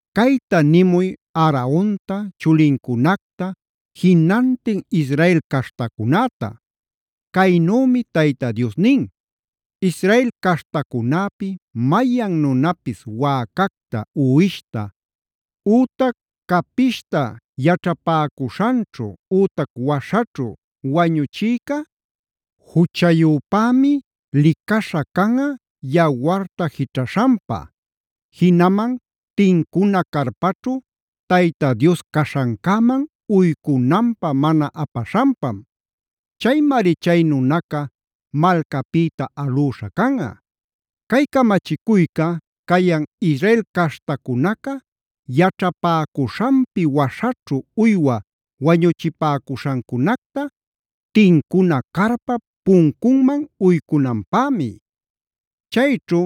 “Cayta nimuy Aaronta, chulincunacta, jinantin Israel caśhtacunäta: Caynümi Tayta Dios nin: Israel caśhtacunäpi mayan nunapis wäcacta, uwishta, ütac capishta yaćhapäcuśhanćhu ütac waśhaćhu wañuchïca, juchayüpämi licaśha canꞌa yawarta jićhaśhanpa; jinaman tincuna carpaćhu Tayta Dios caśhancäman uycunanpä mana apaśhanpam. Chaymari chay nunaca malcapïta alüśha canꞌa. Cay camachicuyca cayan Israel caśhtacunaca yaćhapäcuśhanpi waśhaćhu uywa wañuchipäcuśhancunacta tincuna carpap puncunman uycunanpämi. Chayćhu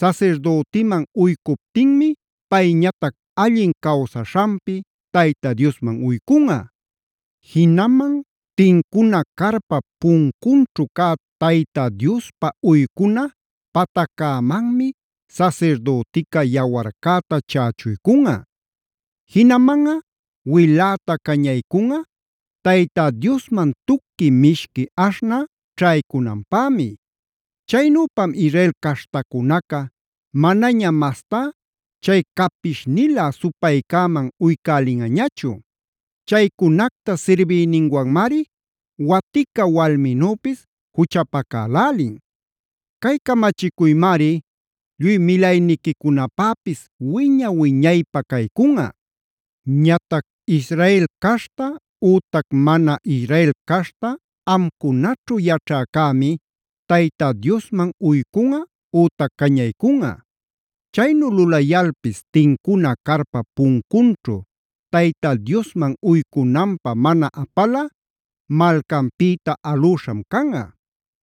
sasirdütiman uycuptinmi payñatac allin cawsaśhanpi Tayta Diosman uycunꞌa. Jinaman tincuna carpap puncunćhu cä Tayta Diospä uycuna pataccämanmi sasirdütica yawarcäta chächuycunꞌa. Jinamanꞌa wiläta cañaycunꞌa Tayta Diosman tuqui mishqui aśhnä ćhaycunanpämi. Chaynüpam Israel caśhtacunaca manaña mastá chay capishnilä supaycäman uycälinꞌañachu. Chaycunacta sirbiyninwanmari watica walminüpis juchapacalälin. Cay camachicuymari lluy milayniquicunapäpis wiña-wiñaypä caycunꞌa. “Ñatac Israel caśhta ütac mana Israel caśhta amcunaćhu yaćhäcämi Tayta Diosman uycunꞌa ütac cañaycunꞌa. Chaynu lulayalpis tincuna carpap puncunćhu Tayta Diosman uycunanpä mana apalꞌa malcanpïta alüśham canꞌa.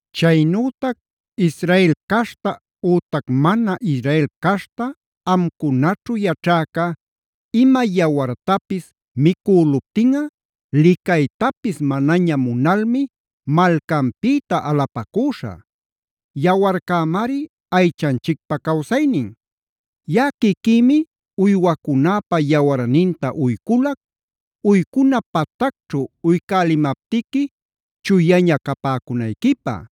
“Chaynütac Israel caśhta ütac mana Israel caśhta amcunaćhu yaćhäca ima yawartapis micüluptinꞌa licaytapis manaña munalmi malcanpïta alapacüśhä.a Yawarcämari aychanchicpä cawsaynin. Yaꞌa quiquïmi uywacunäpa yawarninta uyculac, uycuna patacćhu uycälimaptiqui chuyaña capäcunayquipä.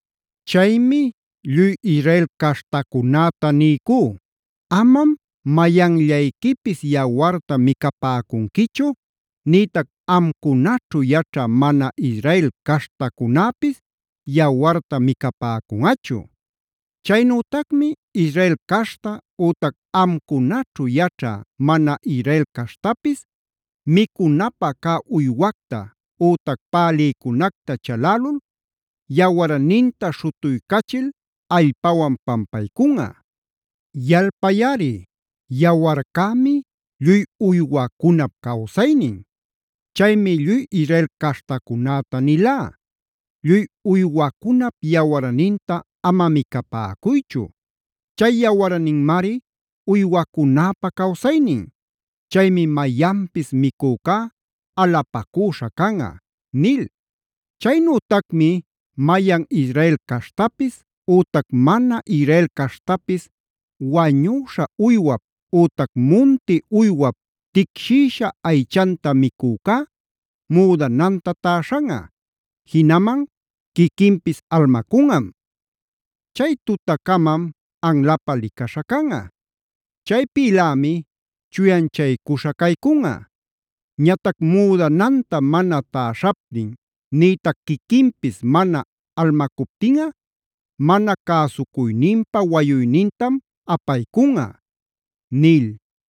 “Chaymi lluy Israel caśhtacunäta niycú: ‘Amam mayanllayquipis yawarta micapäcunquichu; nïtac amcunaćhu yaćhä mana Israel caśhtacunäpis yawarta micapäcunꞌachu’. Chaynütacmi Israel caśhta ütac amcunaćhu yaćhä mana Israel caśhtapis micunapä cä uywacta ütac pälïcunacta chalälul yawarninta śhutuycachil allpawan pampaycunꞌa. Yalpayꞌari, yawarcämi lluy uywacunap cawsaynin. Chaymi lluy Israel caśhtacunäta nilá: ‘Lluy uywacunap yawarninta ama micapäcuychu. Chay yawarninmari uywacunäpa cawsaynin. Chaymi mayanpis micücá alapacüśha canꞌa’ nil. “Chaynütacmi mayan Israel caśhtapis ütac mana Israel caśhtapis wañüśha uywap ütac munti uywap ticshïsha aychanta micücá müdananta täśhanꞌa, jinaman quiquinpis almacunꞌam. Chay tutacamam anlapä licaśha canꞌa. Chaypïlämi chuyanchaycuśha caycunꞌa. Ñatac müdananta mana täśhaptin nïtac quiquinpis mana almacuptinꞌa mana cäsucuyninpa wayuynintam apaycunꞌa” nil.